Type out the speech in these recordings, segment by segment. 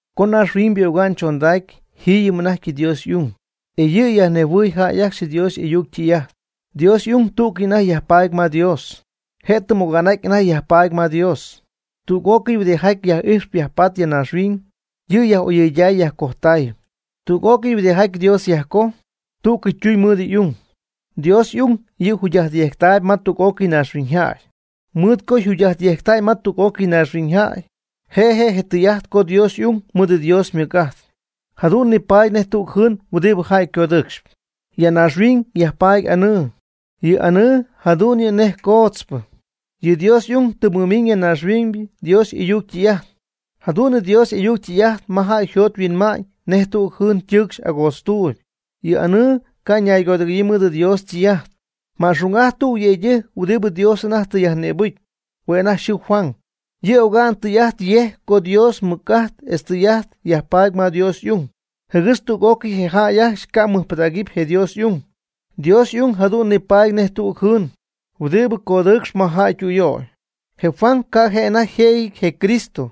Co naaxhuiñybɨ oga'n chondacy jiiyɨm anajty Dios y'ung, e yɨ' yajnejhuɨɨy jäy ajcxy Dios y'ayuc ytɨy'ajt. Dios y'ung tú'cɨy anajty yajpaady ma Dios. Je' tɨm oga'n'aty anajty yajpatp ma Dios. Tüg'ócɨy huɨdijaty yaj'ijxp yajpatp ya naaxhuiñ, yɨ' yaj'oyɨyday yajcojtay. Tüg'ócɨy huɨdijaty Dios yajcojy, tú'cɨy ytuñ mɨɨd y'ung. Dios y'ung yɨ' jugy'ajtyejctaayb ma tüg'ócɨy naaxhuiñyjäy. Mɨɨd co jugy'ajtyejctäy ma tüg'ócɨy naaxhuiñyjäy, je' je' tɨy'ajt co Dios y'ung ymɨɨd Dios ymɨc'ajt. Jadu'n nipaady nej tüg jɨɨn huɨdibɨ jäy codɨɨcxp. Ya naaxhuiñ yajpaady anɨɨ. Yɨ anɨɨ jadu'n yɨ' nej coodzpɨ. Yɨ Dios y'ung tɨ mɨmiñ ya naaxhuiñ Dios y'ayuc ytɨy'ajt. Jadu'n Dios y'ayuc ytɨy'ajt ma jäy yjot yhuinma'ñ nej tüg jɨɨn ytɨɨcxy agoodztuuyb. Yɨ anɨɨ ca' ñaygodɨgɨ̈yii mɨɨd Dios ytɨy'ajt. Ma'xung'ajt tüg yëydɨjc huɨdibɨ Dios anajty tɨ yajnïbɨcy. Hue' anajty yxɨɨ Juan. Yɨ' oga'n tɨy'ajt yejc co Dios ymɨc'ajt etz ytɨy'ajt yajpaady ma Dios y'ung, jɨgɨx tüg'ócɨy je jäy ajcxy camɨbɨjctähuɨpy je Dios y'ung. Dios y'ung jadu'n nipaady nej tüg jɨɨn huɨdibɨ codɨɨcxp ma jäy ytüyöy. Je Juan ca' je' anajty yjëjɨty je Cristo,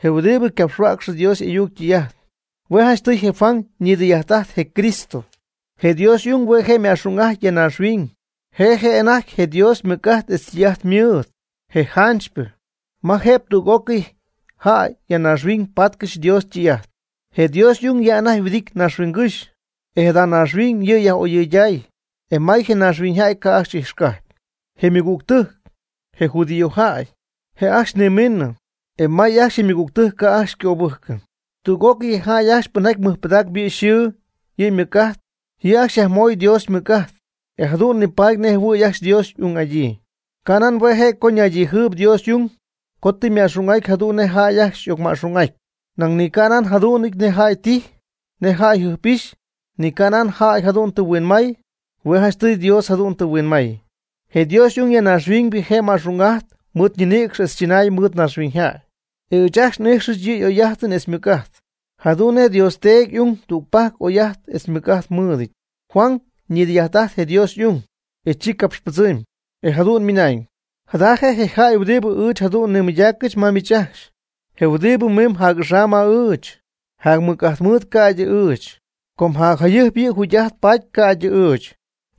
je huɨdibɨ capxhuäcxp Dios y'ayuc ytɨy'ajt. Hue' janchtɨy je Juan ñidɨy'ajt'ajt je Cristo. Je Dios y'ung hue' je' ma'xung'ajty ya naaxhuiñ. Je' je' anajty je Dios ymɨc'ajt etz ytɨy'ajt ymɨɨd, je janchypɨ, ma jëb tüg'ócɨy jäy ya naaxhuiñ patcɨxy Dios ytɨy'ajt. Je Dios y'ung ya anajty yhuɨdity naaxhuiñygɨ́xy. E jada naaxhuiñ yɨ' yaj'oyɨyday. E may je naaxhuiñyjäy ca' ajcxy ijxcajpy. Je ymɨgügtɨjc, je judiojäy, je' ajcxy nimiinɨ, e may ajcxy je ymɨgügtɨjc ca' ajcxy ycöbɨjcɨ. Tüg'ócɨy je jäy ajcxy pɨnjaty mɨjpɨdac yɨ' yxɨɨ yɨ' ymɨc'ajt, yɨ' ajcxy yajmoy Dios ymɨc'ajt, e jadu'n nipaty nejjɨhuɨ̈y ajcxy Dios y'ung'adyii. Canan hue' je' co naydijɨɨyb Dios y'ung co tɨ yma'xung'aty jadu'n nej jäy ajcxy y'ocma'xung'aty. Nañ ni ca' yjadu'nɨty nej jäy tijy, nej jäy jɨjp'ixy, ni canan jäy jadu'n tɨ huinmay. Hue' janchtɨy Dios jadu'n tɨ huinmay. Je Dios y'ung ya naaxhuiñ je' yma'xung'ajty mɨɨd ñinïcx etz chɨnay mɨɨd naaxhuiñyjäy. E ɨɨch ajcxy n'ijxɨch yɨ' y'oy'ajt etz ymɨc'ajt, jadu'n nej Dios Teedy y'ung tügpajc oy'ajt etz mɨc'ajt mɨɨdɨty. Juan ñidɨy'ajt'ajt je Dios y'ung, e chi capxypɨdzɨmy, e jadu'n ymɨnañ: ―Jada je' je jäy huɨdibɨ ɨɨch jadu'n nimɨydaacɨch ma miich ajcxy. Je huɨdibɨ miimb jac'axam ma ɨɨch, jac mɨc'ajt mɨɨd yɨ' ca'ydɨ ɨɨch, com jacjayɨjp yɨ' jugy'ajt paty ca'ydɨ ɨɨch.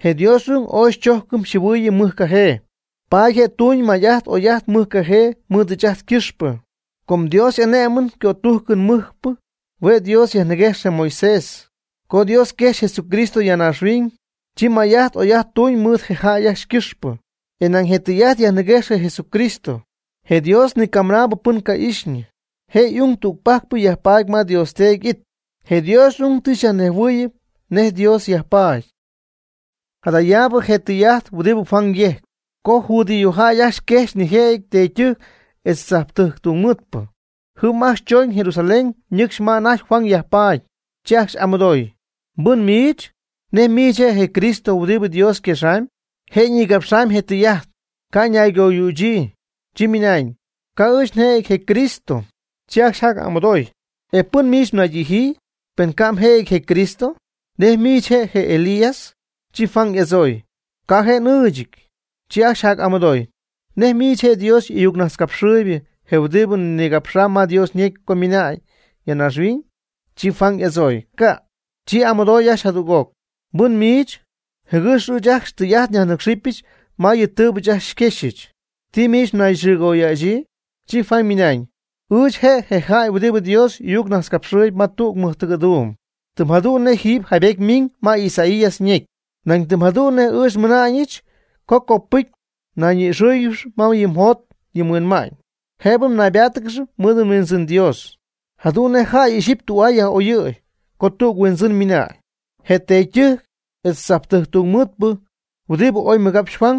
Je Dios y'ung oy xychojcɨm xyjɨhuɨɨyɨm mɨjcajee, paady je' tuuñ may'ajt oy'ajt mɨjcajee mɨɨd ɨɨch ajt ycɨxpɨ. Com Dios y'ané'mɨn ycötujcɨn mɨcpɨ hue' Dios yajniguejx je Moisés. Co Dios quejxy Jesucristo ya naaxhuiñ, chi may'ajt oy'ajt tuñ mɨɨd je jäy ajcxy ycɨxpɨ, e nañ je' ytɨy'ajt yajniguejx je Jesucristo. Je Dios ni camɨnaabɨ pɨn ca'ixyñɨ, je y'ung tügpajcɨ yajpatp ma Dios Teedy ity. Je Dios y'ung tɨ xyajnejhuɨɨyɨm nej Dios yajpaady. Jadaabɨ je' je tɨy'ajt huɨdibɨ Juan yejc, co judío jäy ajcxy quejxy nijëjɨty teedytɨjc etz tzajptɨjc tungmɨɨdpɨ. Jɨm ajcxy chooñ Jerusalén nɨcxy ma anajty Juan yajpaady, chi ajcxy y'amɨdooy: ―¿Mbɨn miich? ¿Nej miich je' je Cristo huɨdibɨ Dios yquexamy? Je' ñigapx je tɨy'ajt, ca' ñaygoyützɨ, chi ymɨnañ: ―Ca' ɨɨch njëjɨty je Cristo. Chi ajcxy jac'amɨdoy: ―¿E pɨn miich mnaydijyii? Pen ca' mjëjɨty je Cristo. ¿Nej miich je' je Elías? Chi Juan y'adzooy: ―Ca' je' n'ɨɨchɨty. Chi ajcxy jac'amɨdooy: ―¿Nej miich je' je Dios y'ayuccapxhuäcxpɨ, je huɨdibɨ ñigapxy ma Dios ñecy co ymiinañ ya naaxhuiñ? Chi Juan y'adzooy: ―Ca'. Chi y'amɨdooy ajcxy jadüg'oc: ―¿Mbɨn miich? Jɨgɨx ɨɨch ajcxy tɨy'ajt nyajnɨ́cxɨbɨch ma yɨ tɨɨbɨ ɨɨch ajcxy xyquexyɨch. ¿Ti miich nayxɨɨgoyäxyii? Chi Juan ymɨnañ: ―Ɨɨch je' je jäy huɨdibɨ Dios y'ayuccapxhuäcxɨp ma tüg mɨjtɨgɨ̈duum, tɨm jadu'n nej jiiby jaybety ymiiñ ma Isaías ñecy, nañ tɨm jadu'n ɨɨch nmɨna'ñɨch co copɨcy nayñi'ixɨ́ɨyɨgɨx ma yɨ mjot yɨ mhuinma'ñ, jëbɨ naybáatɨgɨxy mɨɨd mHuindzɨn Dios. Jadu'n nej jäy ixyipy tü'aa yaj'oyɨ̈y co tüg huindzɨn ymiina'ñ. Je teedytɨjc etz tzajptɨjc tungmɨɨdpɨ huɨdibɨ oy mɨgapxy Juan,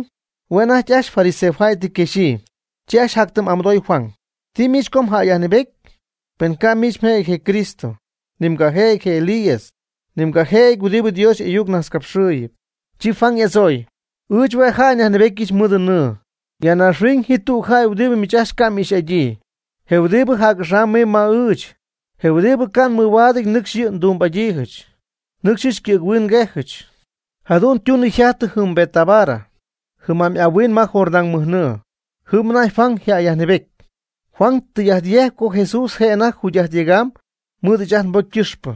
hue' anajty ajcxy fariseojäy tɨ yquexyii. Chi ajcxy jactɨm'amɨdoy Juan: ―¿Ti miich co mjäyyajnɨɨbety? Penɨ ca' miich mjëjɨty je Cristo, ni mgajëjɨty je Elías, ni mgajëjɨty huɨdibɨ Dios y'ayuc najtzcapxɨɨyɨp. Chi Juan y'adzooy: ―Ɨɨch hue' jäy nyajnɨɨbetyɨch mɨɨd nɨɨ. Ya naaxhuiñ ji tüg jäy huɨdibɨ miich ajcxy ca' m'ixy'adyii. Je' huɨdibɨ jac'axam mimb ma ɨɨch, je huɨdibɨ ca' mɨhuaadɨty nɨcxy yɨ' xytumbɨ'adyiijɨch, nɨcxyɨch ycɨ̈ghuin nguejɨch. Jadu'n ytunɨ yjajtɨ jɨm Betábara, jɨm'amy ahuin ma Jordán mɨj nɨɨ, jɨm anajty Juan jäy yajnɨɨbety. Juan tɨy'ajt yejc co Jesús je' anajty yjugy'ajt yegam mɨɨd ɨɨch ajt nbocy ycɨxpɨ.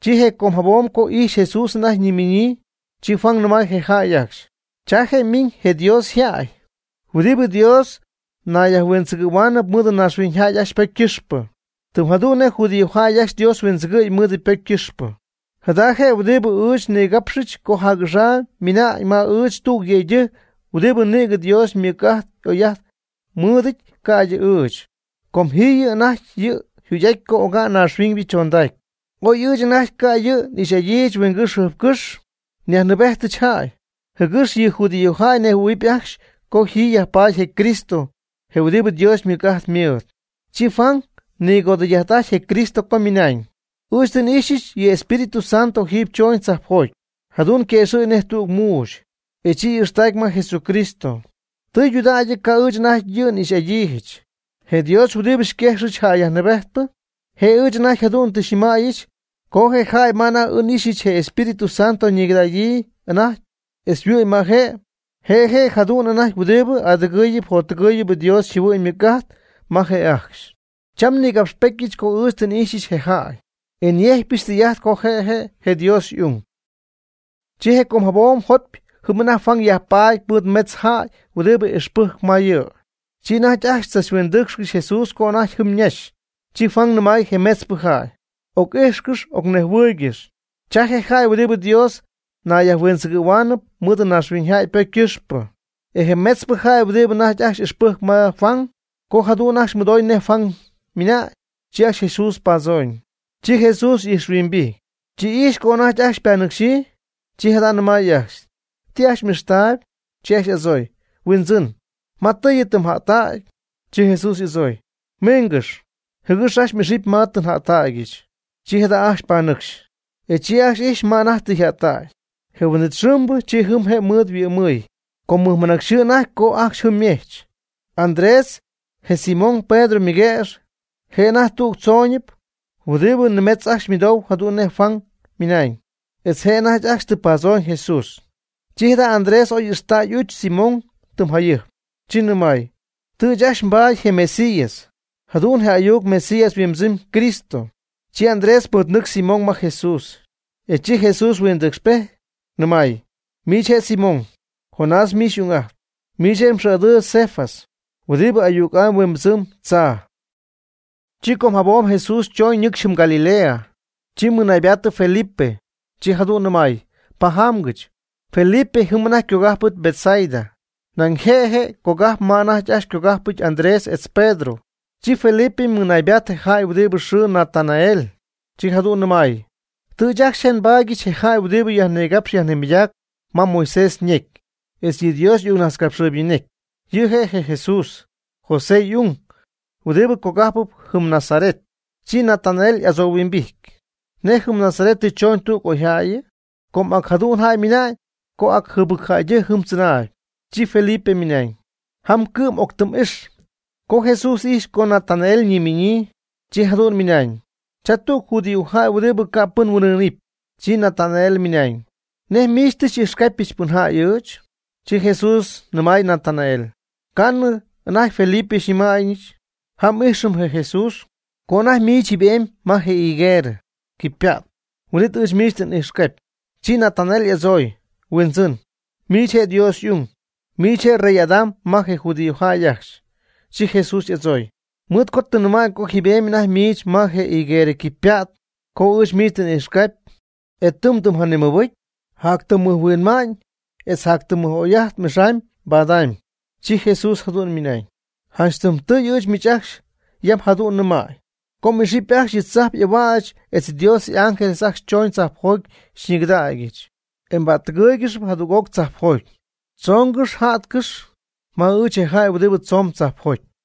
Chi je com jabom co ijxy Jesús anajty ñimiñyii, chi Juan nɨmay je jäy ajcxy: ―Cha je' ymiñ je Dios yjäy huɨdibɨ Dios nayyajhuindzɨgɨ̈huaanɨp mɨɨd naaxhuiñyjäy ajcxy ypocy ycɨxpɨ. Tɨm jadu'n nej judíojäy ajcxy Dios huindzɨgɨ̈y mɨɨd ypocy ycɨxpɨ. Jada je' huɨdibɨ ɨɨch nnigapxypɨch co jac'axam ymiina'ñ ma ɨɨch tüg yëydɨjc huɨdibɨ nïgɨ Dios ymɨc'ajt y'oy'ajt mɨɨdɨty ca'ydɨ ɨɨch. Com jiiyɨm anajty yɨ' yjugy'aty co oga'n naaxhuiñybɨ chondacy. Oy ɨɨch anajty ca' yɨ' n'ixy'adyiijɨch huingɨ́xy jɨjpcɨ́xy, nyajnɨɨbejtɨch jäy, jɨgɨx yɨ judíojäy nejhuɨ̈huɨp ajcxy co ji yajpaady je Cristo je huɨdibɨ Dios ymɨc'ajt mɨɨd. Chi Juan nigodɨy'ajt'ajty je Cristo co ymɨna'ñ: ―Ɨɨch tɨ n'ixyɨch yɨ Espíritu Santo jiiby choñ tzajpjoty, jadu'n yquëxɨ̈gy nej tüg muuxy, e chi y'ixtacy ma Jesucristo. Tɨydudägy ca' ɨɨch anajty n'ixy'adyiijɨch. Je Dios huɨdibɨ xyquejxɨch jäy yajnɨɨbejtpɨ, je' ɨɨch anajty jadu'n tɨ xyñɨmäyɨch co je jäy ma anajty n'ixyɨch je Espíritu Santo ñigɨdägyii anajty etz yhuɨ'my ma je'. Je' je' jadu'n anajty huɨdibɨ y'adɨgɨ̈huɨpy yjottɨgɨ̈huɨpy Dios yjɨhuɨ'ñ ymɨc'ajt ma je jäy ajcxy. Cham nnïgapxpetyɨch co ɨɨch tɨ n'ixyɨch je jäy, e nyejcpyɨch tɨy'ajt co je' je' je Dios y'ung. Chi je com jabom jopy jɨm anajty Juan yajpaady mɨɨd metz jäy huɨdibɨ ixpɨjcp ma yɨ'. Chi anajty ajcxy tzachhuindɨcxy Jesús co anajty jɨm ñaxy, chi Juan nɨmay je metzpɨ jäy: ―Oc'ijxcɨx ocnejhuɨɨygɨx, cha je jäy huɨdibɨ Dios nayyajhuindzɨgɨ̈huaanɨp mɨɨd naaxhuiñyjäy ypocy ycɨxpɨ. E je metzpɨ jäy huɨdibɨ anajty ajcxy ixpɨjcp ma Juan, co jadu'n ajcxy mɨdoy nej Juan ymɨnañ, chi ajcxy Jesús padzooñ. Chi Jesús y'ijxhuimbijty, chi ijxy co anajty ajcxy ypanɨcxyii, chi jada' nɨmay ajcxy: ―¿Ti ajcxy m'ixtaayb? Chi ajcxy y'adzooy: ―Huindzɨn, ¿ma tɨɨyɨ tɨ mja'ttägy? Chi Jesús y'adzooy: ―Miingɨx, jɨgɨx ajcxy m'ixɨpy ma tɨ nja'ttägyɨch. Chi jada' ajcxy panɨcxy, e chi ajcxy ijxy ma anajty tɨ yja'ttägy. Je huin'it xɨɨmbɨ chi jɨm je' mɨɨd yhuɨ'mɨy, com mɨjmɨnacyxɨɨ anajty co ajcxy jɨm ymejch. Andrés, je Simón Pedro ymɨguëx, je' anajty tüg tzoonɨp huɨdibɨ nimetz ajcxy mɨdou jadu'n nej Juan ymɨnañ, etz je' anajty ajcxy tɨ padzooñ Jesús. Chi jada' Andrés oy ixtäy y'uch Simón tɨm jayɨjp, chi nɨmay: ―Tɨ ɨɨch ajcxy nbaady je Mesías ―jadu'n je ayuc Mesías yhuimbɨdzɨma'ñ Cristo. Chi Andrés mɨɨdnɨcxy Simón ma Jesús, e chi Jesús huindɨcxpejty, nɨmay: ―Miich je' Simón, Jonás miich xy'ung'ajtp. Miich je' mxɨɨ'adɨɨyb Cefas ―huɨdibɨ ayuc'amy huimbɨdzɨmb tzaa. Chi com jabom Jesús chooñ ñɨcxy jɨm Galilea, chi mɨnaybaatɨ Felipe, chi jadu'n nɨmay: ―Pajamgɨch. Felipe jɨm anajty ycogajpɨty Betsaida, nañ je' je' je cajp ma anajty ajcxy ycogajpɨty Andrés etz Pedro. Chi Felipe mɨnaybaatɨ je jäy huɨdibɨyxɨɨ Natanael, chi jadu'n nɨmay: ―Tɨ ɨɨch ajcxy je' nbaadyɨch je jäy huɨdibɨ yajnigapxp yajnimɨydacp ma Moisés ñecy, etz yɨ Dios y'ayucnajtzcapxɨɨybɨ ñecy. Yɨ' je' je Jesús, José y'ung huɨdibɨ cogajpɨp jɨm Nazaret. Chi Natanael y'adzohuimbijty: ―¿Nej jɨm Nazaret tɨ choñ tüg oyjäyɨ? Com ac jadu'n jäy ymɨna'ñ co ac jɨbɨcjäydɨjc jɨm tzɨnaayb. Chi Felipe ymɨnañ: ―Jam cɨ'm octɨm'ix. Co Jesús ijxy co Natanael ñimiñyii, chi jadu'n ymɨnañ: ―Cha tüg judíojäy huɨdibɨ ca' pɨn huin'ɨɨnɨpy. Chi Natanael ymɨnañ: ―¿Nej miich tɨ xy'ijxcapyɨch pɨn jäy ɨɨch? Chi Jesús nɨmay Natanael: ―Ca'nɨ anajty Felipe xyñɨmaayñɨ: “Jam íjxɨm je Jesús” co anajty miich jiiby'emy ma je higuerɨ quipypa't, huin'it ɨɨch miich tɨ n'ijxcapy. Chi Natanael y'adzooy: ―Huindzɨn, miich je' Dios y'ung. Miich je' Rey'adam ma je judíojäy ajcxy. Chi Jesús y'adzooy: ―Mɨɨd co tɨ nnɨmäy co jiiby'emy anajty miich ma je higuerɨ quipypa't co ɨɨch miich tɨ n'ijxcapy. ¿E tɨ mdɨmjanimɨbɨcy? Jactɨmmɨjhuinma'ñ etz jactɨmmɨj'oy'ajt m'ixamyb mbadamyb. Chi Jesús jadu'n ymɨnañ: ―Janch tɨm tɨy ɨɨch miich ajcxy yam jadu'n nɨmäy co m'ixɨpy ajcxy yɨ tzajp y'ahuäch etz Dios y'ángeles ajcxy chooñ tzajpjoty xyñigɨdägyɨch, e ypa'ttɨgɨɨygɨxy jadüg'oc tzajpjoty. Choongɨxy yja'tcɨxy ma ɨɨch je jäy huɨdibɨ tzoon tzajpjoty.